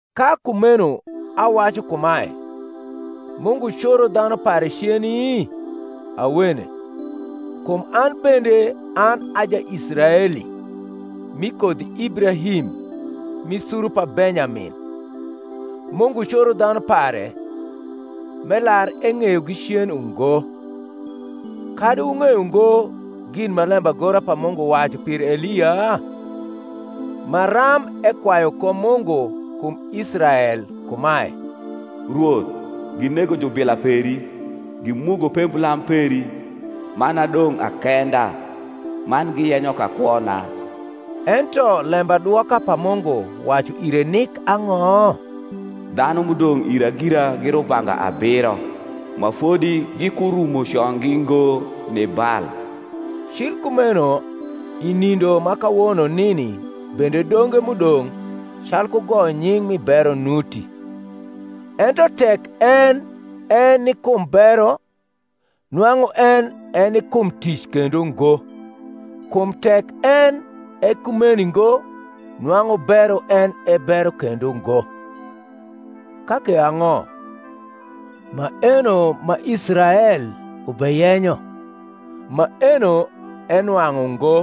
Ka kumeno awacu kumae, Mungu coro dhanu pare ceni? Awene. Kum an bende an a Jaisraeli, mi kodhi Ibrahim, mi suru pa Benyamin. Mungu coro dhanu pare m’elar eng’eyogi cen ungo. Kadi wung’eyo ngo gin ma lembagora pa Mungu wacu pir Elia? maram ekwayu ko Mungu kum Israel kumae: Rwoth, ginego jubila peri, gimugo pemblam peri; man adong’ akenda, man giyenyo ka kwona. Ento lembadwoka pa Mungu wacu ire nik ang’o? Dhanu m’udong’ ira gira gi rubanga abiro, ma fodi gikurumo conggi ngo ni Bal. Cil kumeno i nindo ma kawono nini bende donge m’udong’ calku goyo nying’ mi bero nuti. Ento tek en e ni kum bero, nwang’u en e ni kum tic kendo ngo: kum tek en e kumeni ngo nwang’u bero en e bero kendo ngo. Ka ke ang’o? Maeno ma Israel ubeyenyo, maeno enwang’u ngo;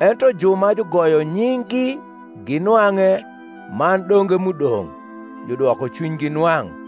ento ju ma jugoyo nying’gi ginwang’e man donge m’udong’ judwoko cwinygi nwang’: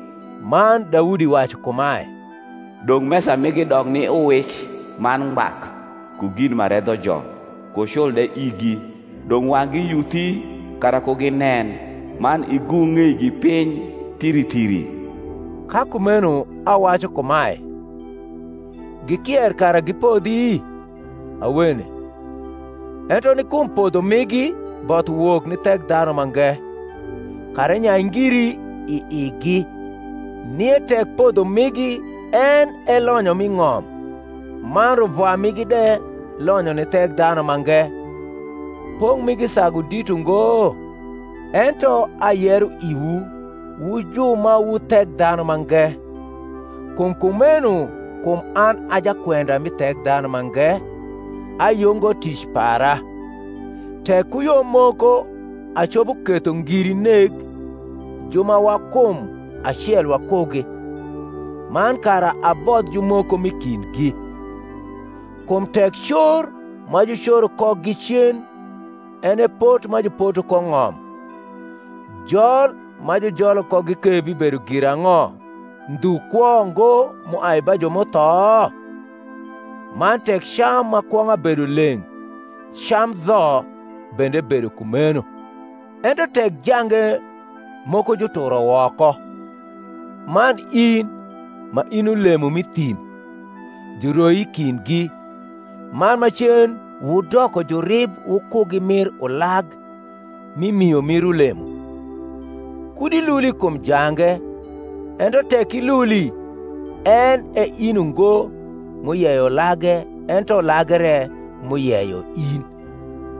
Man Daudi wacu kumae, Dong’ mesa migi dok ni uwic, man ngbak, Ku gin ma redhojo, ku cul de igi: Dong’ wang’gi yuthi, kara ku ginen, Man igung’ ng’eigi piny thiri thiri. Ka kumeno awacu kumae, Gikier kara gipodhi? Awene: ento ni kum podho migi both uwok ni Thekdhanumange, kara enyai ngiri i igi. Nie tek podho migi en e lonyo mi ng’om, man ruvwa migi de lonyo ni Thekdhanumange; pong’ migi sagu dit ungo? Ento ayero iwu wu ju ma wu Thekdhanumange. Kum kumeno kum an a jakwenda mi Thekdhanumange, ayungo tic para; tek ku yo moko acopo ketho ngiri neg ju ma wa kum acel wakugi, man kara abodh jumoko m’i kindgi. Kum tek cor ma jucoro kogi cen en e pot ma jupoto ko ng’om, jol ma jujolo kogi ke bibedo girang’o, ndhu kwo ngo m’uai ba ju m’utho? Man tek cam ma kwong’a bedo leng’, cam dho bende bedo kumeno. Ento tek jange moko juturo woko, man in, ma in ulemo m’i thim, juroi i kindgi, man macen wudoko jurib wukugi mir ulag mi mio mir ulemo; kud iluli kum jange: ento tek iluli, en e in ungo m’uyeyo ulage ento ulage re m’uyeyo in.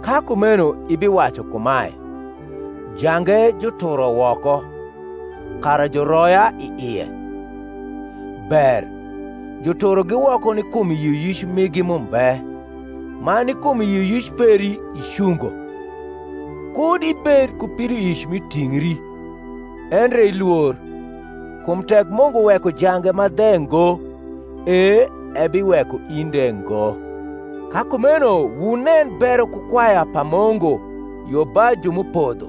Ka kumeno ibiwacu kumae, Jange juturo woko, kara juroya i ie. Ber; juturogi woko ni kum yioyic migi m’umbe, man ni kum yioyic peri icungo. Kud ibed ku pidoic mi tingri, endre ilwor: kum tek Mungu weko jange ma dhe ngo, e ebiweko in de ngo. Ka kumeno wunen bero ku kwaya pa Mungu: yo ba ju m’upodho,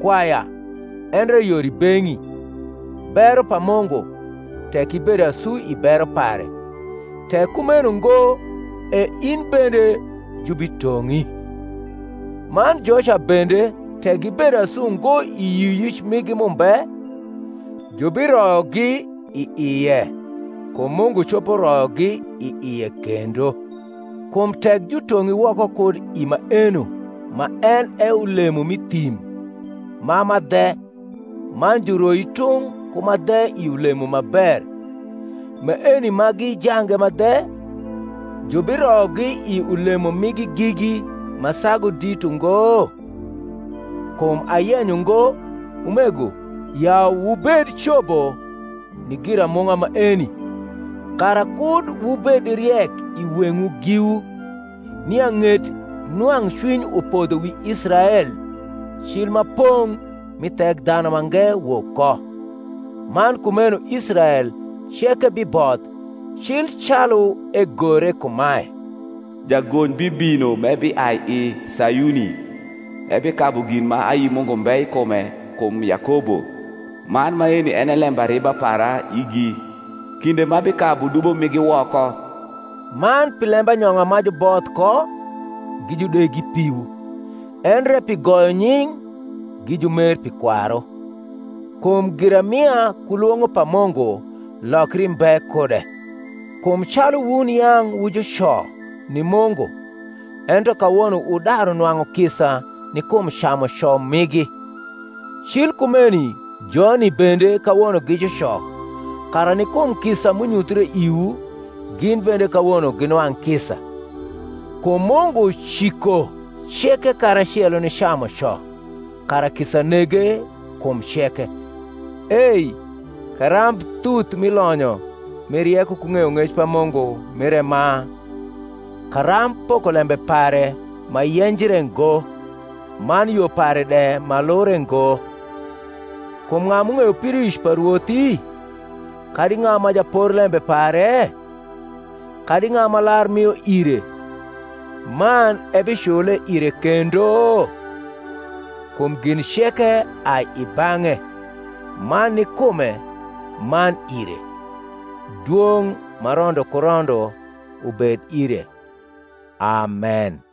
kwaya; endre yor i beng’i, bero pa Mungu, tek ibedo asu i bero pare: tek kumeno ngo e in bende jubitong’i. Man joca bende, tek gibedo asu ngo i yioyic migi m’umbe, jubiroyogi i ie: kum Mungu copo royogi i ie kendo. Kum tek jutong’i woko kud i maeno ma en e ulemo m’i thim ma ma dhe, man juroi tung’ ku ma dhe i ulemo ma ber; maeni ma gi jange ma dhe, jubiroyogi i ulemo nngi gigi ma sagu dit ungo? Kum ayenyo ngo, umego, ya wubed cobo ni giramung’a maeni, kara kud wubed riek i weng’wu giwu, nia ng’et nwang’cwiny upodho wi Israel, cil ma pong’ mi Thekdhanumange wok ko; man kumeno Israel ceke biboth: cil calu egore kumae, Jagony bibino m’ebiai i Sayuni; Ebikabu gin ma ayi Mungu mbe i kume kum Yakobo: Man maeni en e lembariba para igi, Kinde m’abikabu dubo migi woko. Man pi lembanyong’a ma juboth ko, gi judegi piwu: endre pi goyo nying’, gi jumer pi kwaru. Kum giramia ku lwong’o pa Mungu lokri mbe kude. Kum calu wun yang’ wu juco ni Mungu, ento kawono wudaru nwang’u kisa ni kum camuco migi, cil kumeni joni bende kawono gi juco, kara ni kum kisa m’unyuthre iwu gin bende kawono ginwang’ kisa. Kum Mungu ciko ceke karacelo ni camuco, kara kisa nege kum ceke. Ei karamb thuth mi lonyo mi rieko ku ng’eyong’ec pa Mungu mire ma! karamb pokolembe pare ma yenjre ngo, man yo pare de ma lure ngo! Kum ng’a m’ung’eyo pidoic pa Rwothi? kadi ng’a ma japorlembe pare? kadi ng’a ma lar mio ire, man ebicnie ire kendo? Kum gin ceke ai i bang’e, man ni kume, man ire. Dwong’ ma rondo ku rondo ubed ire. Amen.